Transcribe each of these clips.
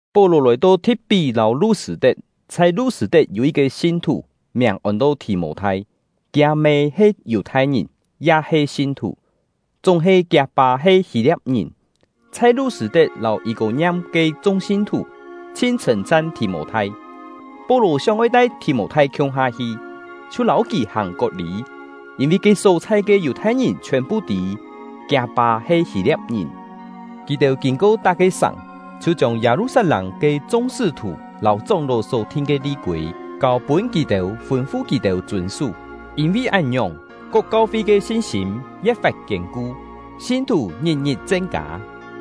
Pó-lò lòi-to Thi̍t-pí lâu Lu-sṳ̂-tet. Chhai Lu-sṳ̂-tet yû yit-ke sin-thù, miàng ôn-to Thì-mô-thai. Kiâ-mê he Yù-thai-ngìn, ya he sin-thù, chúng-he kiâ-pâ he Hî-lia̍p-ngìn. Chhai Lu-sṳ̂-tet lâu Yî-kô-ngiam ke chung sin-thù chhin chhṳ̂n-chan Thì-mô-thai. Pó-lò sióng-oi tai Thì-mô-thai khiung-ha hi, chhiu lâu kì hàng kot-lî, yîn-vi ke só-chhai ke Yù-thai-ngìn chhiòn-phu tî kiâ-pâ he Hî-lia̍p-ngìn. Kì-têu kîn-ko tak-ke sàng, chhiu chiông Yâ-lu-sat-lâng ke chung sṳ́-thù lâu chóng-ló só-thin ke li-kûi kâu-pûn kì-têu, fûn-fu kì-têu chûn-sú. Yîn-vi án-ngiòng, kok kau-fi ke sin-sîm ye̍t-fat kiên-ku, sin-thù ngit-ngit chen-kâ.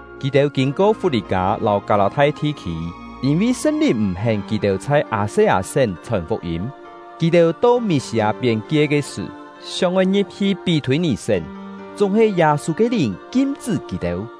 Kì-têu kîn-ko Fut-lî-kâ lâu Kâ-lâ-thai thi-khî, yîn-vi Sṳn-Lìn m̀-hén kì-têu chhai Â-se-â-sén chhòn fuk-yîm. Kì-têu to Mî-sî-â piên-kie ke sṳ̀, sióng-oi ngi̍p-hi Pí-thûi-nì-sén, chúng-he Yâ-sû ke Lìn kim-chṳ́ kì-têu,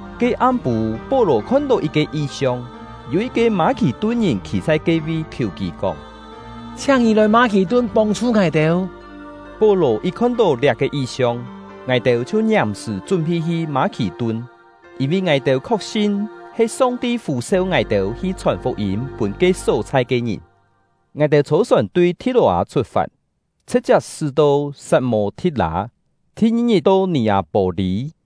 Ke am-pû, Pó-lò khon-tó yit-ke yi-siong: Yû yit-ke Mâ-khì-tun-ngìn khî chhai ke-vi, khiù kì kóng: “Chhiáng ngì lòi Mâ-khì-tun pông-chhu ngài-têu!” Pó-lò yit khon-tó liá-ke yi-siong, ngài-têu chhiu ngiàm-sṳ̀ chún-phi hi Mâ-khì-tun, yîn-vi ngài-têu khok-sin he Song-ti fû-seu ngài-têu hi chhòn fuk-yîm pûn ke só-chhai ke ngìn. Ngài-têu chhô-sòn tui Thi̍t-lò-â chhut-fat, chhṳ̍t-chiap sṳ́-to Sat-mô-thi̍t-lâ, thi-ngi-ngit to Nì-â-pô-lî.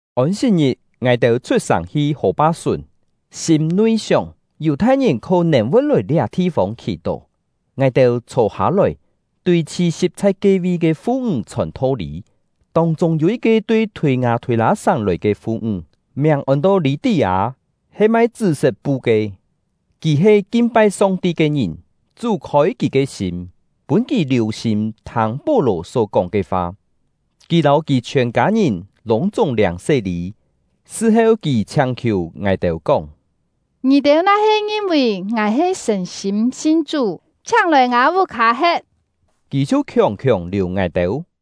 Ôn-sit-ngit, ngài-têu chhut-sàng hi hò-pa-sùn, sîm-nui sióng, Yù-thai-ngìn khó-nèn voi lòi liá thi-fông khì-tó. Ngài-têu chhô-hâ-lòi, tui chhi-si̍p chhai ke-vi ke fu-ńg chhòn tho-lî. Tông-chûng yû yit-ke tui Thûi-ngâ-thûi-lâ-sàng lòi ke fu-ńg, miàng ôn-to Lî-tí-â, he mai chṳ́-set pu ke. Kì he kin-pai Song-ti ke ngìn; Chú khôi kì ke sîm, pûn kì liù-sîm thâng Pó-lò só kóng ke fa. Kì lâu kì chhiòn kâ-ngìn lûng-chúng liâng sé-lî. Sṳ-heu, kì chhiáng-khiù ngài-têu kóng: “Ngì-têu na-he ngin-vì ngài he sṳ̀n-sîm sin Chú, chhiáng lòi ngâ vuk-hâ he̍t.” Kì chhiu khiòng-khiòng liù ngài-têu.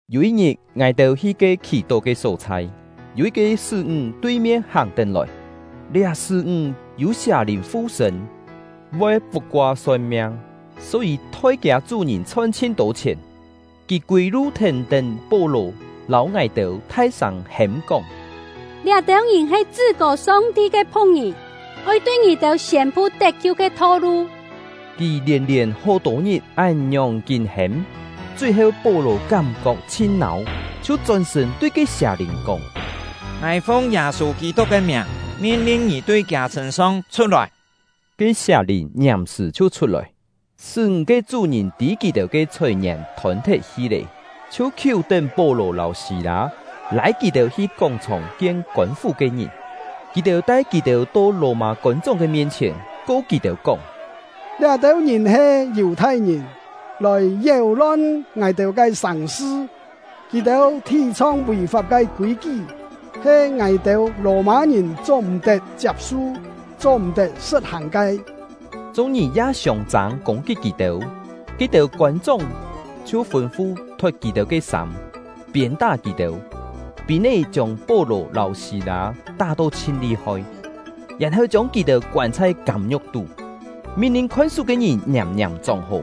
Yû yit-ngit, ngài-têu hi ke khì-tó ke só-chhai, yû yit-ke sṳ́-ńg tui-mien hàng-tén lòi. Liá sṳ́-ńg yû sià-lìn fu-sṳ̂n, voi puk-koa son-miang, só-yî thoi kiâ chú-ngìn chhon chhin-tô chhièn. Kì kûi-lu thèn-tén Pó-lò lâu ngài-têu, thai-sâng hêm-kóng: “Liá-têu ngìn he Chṳ-kô Song-ti ke phu̍k-ngìn, oi tui ngì-têu siên-pu tet-kiu ke tho-lu!” Kì lièn-lièn hó-tô ngit án-ngiòng kín hêm; chui-heu Pó-lò kám-kok chhin nâu, chhiu chón-sṳ̂n, tui ke sià-lìn kóng: “Ngài fung Yâ-sû Kî-tuk ke miàng, min-lin ngì tui kiâ sṳ̂n-song chhut-lòi!” Ke sià-lìn ngiàm-sṳ̀ chhiu chhut-lòi. Sṳ́-ńg ke chú-ngìn tî kì-têu ke chhòi-ngièn thôn-thet-hi lé, chhiu khiú-tén Pó-lò lâu Sî-lâ, lâi kì-têu hi kóng-chhòng kien kôn-fú ke ngìn. Kì-têu tai kì-têu to Lò-mâ kôn-chóng ke mien-chhièn, ko kì-têu kóng: “Liá-têu ngìn he Yù-thai-ngìn, lòi yéu-lon ngài-têu ke sàng-sṳ. Kì-têu thì-chhong vì-fap ke kûi-kí, he ngài-têu Lò-mâ-ngìn cho-m̀-tet chiap-su, cho-m̀-tet sṳ̍t-hàng ke!” Chung-ngìn ya siông-châng kûng-kit kì-têu; ke-têu kôn-chóng chhiu fûn-fu thot kì-têu ke sâm, piên-tá kì-têu. Pîn-é chiông Pó-lò lâu Sî-lâ tá-to chhin li-hoi, yèn-heu chiông kì-têu koân chhai kâm-ngiu̍k tú, min-lin khon-sú ke ngìn ngiàm-ngiàm chóng-hó.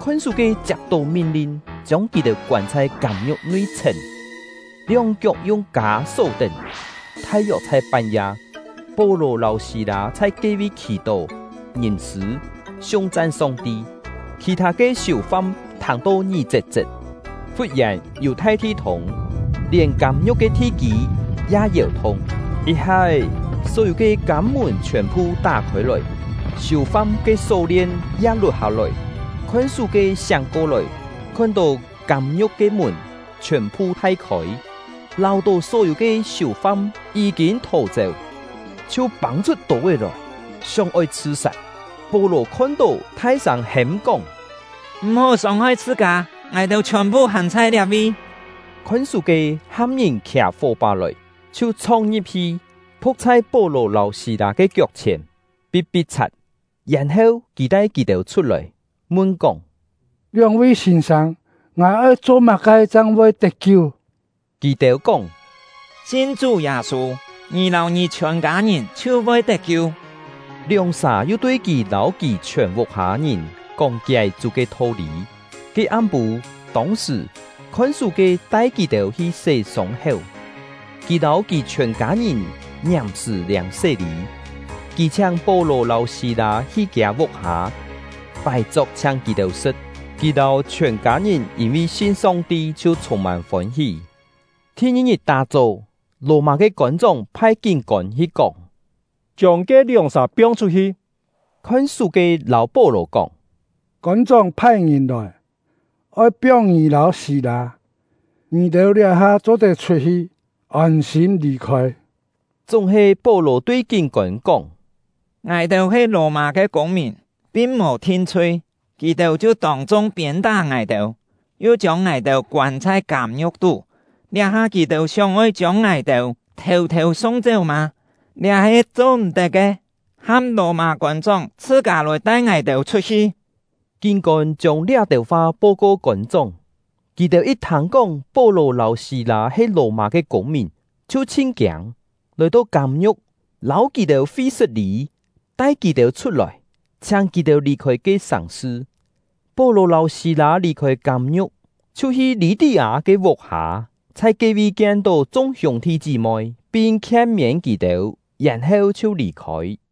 Khon-sú-ke chiap-tó min-lin, chiông kì-têu koân chhai kâm-ngiu̍k nui-chhèn, lióng-kiok yung kâ só-tén. Thai-yok chhai pan-ya, Pó-lò lâu Sî-lâ chhai ke-vi khì-tó, ngìm-sṳ̂ siung-chan Song-ti, khì-thâ ke siù-fam thâng-to ngí-chet-chet. Fut-yèn, yû thai thi-thûng, lièn kâm-ngiu̍k ke thi-kî ya yèu-thung; yit-ha-é, só-yû ke kâm-mùn chhiòn-phu tá khôi-lòi, siù-fam ke só-lien ya lut-hâ-lòi. Khon-sú-ke siáng ko-lòi, khon-tó kâm-ngiu̍k ke mùn chhiòn-phu thai khôi, láu-tó só-yû ke siù-fam yí-kîn thò-chéu, chhiu pâng-chhut tô-é lòi, sióng-oi chhṳ-sat. Pó-lò khon-tó, thai-sâng hêm-kóng: “M̀-hó sông-hoi chhṳ-kâ, ngài-têu chhiòn-phu hàn chhai liá-vi!” Khon-sú-ke ham ngìn khià fó-pá lòi, chhiu chhong-ngi̍p-hi, phu̍k chhai Pó-lò lâu Sî-lâ ke kiok-chhièn, pi̍t-pi̍t-chhat. Yèn-heu, kì tai kì-têu chhut-lòi, mun kóng: “Lióng-vi sîn-sâng, ngài oi cho má-ke chang voi tet-kiu?” Kì-têu kóng: “Sin Chú Yâ-sû, ngì lâu ngì chhiòn kâ-ngìn chhiu voi tet-kiu.” Lióng-sà yu tui kì lâu kì chhiòn vuk-hâ ngìn kóng-kié Chú ke tho-lî. Ke am-pû, tông-sṳ̀, khon-sú-ke tai kì-têu hi sé sông-héu; kì lâu kì chhiòn kâ-ngìn ngiàm-sṳ̀ liâng sé-lî. Kì chhiáng Pó-lò lâu Sî-lâ hi kiâ vuk-hâ, pài-chok chhiáng kì-têu sṳ̍t. Kì lâu chhiòn kâ-ngìn yîn-vi sin Song-ti, chhiu chhûng-mân fôn-hí. Thi-ngi-ngit tá-chó, Lò-mâ ke kôn-chóng phai kín-kôn hi kóng: “Chiông ke lióng-sà piong-chhut-hi!” Khon-sú-ke lâu Pó-lò kóng: “Kôn-chóng phai ngìn lòi, oi piong ngì lâu Sî-lâ, ngì-têu liá-ha cho-tet chhut-hi, ôn-sîm lì-khôi.” Chúng-he, Pó-lò tui kín-kôn kóng: “Ngài-têu he Lò-mâ ke kûng-mìn, pin mò thin-chhui, kì-têu chhiu tông-chung piên-tá ngài-têu, yu chiông ngài-têu koân chhai kâm-ngiu̍k tú; liá-ha kì-têu sióng-oi chiông ngài-têu thêu-thêu sung-chéu mâ? Liá he cho-m̀-tet ke! Ham Lò-mâ kôn-chóng chhṳ-kâ lòi tai ngài-têu chhut-hi!” Kín-kôn chiông liá-têu fa po-ko kôn-chóng. Kì-têu yit thâng-kóng Pó-lò lâu Sî-lâ he Lò-mâ ke kûng-mìn, chhiu chhin kiâng, lòi-to kâm-ngiu̍k, lâu kì-têu fi-sṳt-lî, tai kì-têu chhut-lòi, chhiáng kì-têu lì-khôi ke sàng-sṳ. Pó-lò lâu Sî-lâ lì-khôi kâm-ngiu̍k, chhiu hi Lî-tí-â ke vuk-hâ, chhai ke-vi kien-tó chung hiûng-thi chí-moi, pin khien-miên kì-têu, yèn-heu chhiu lì-khôi.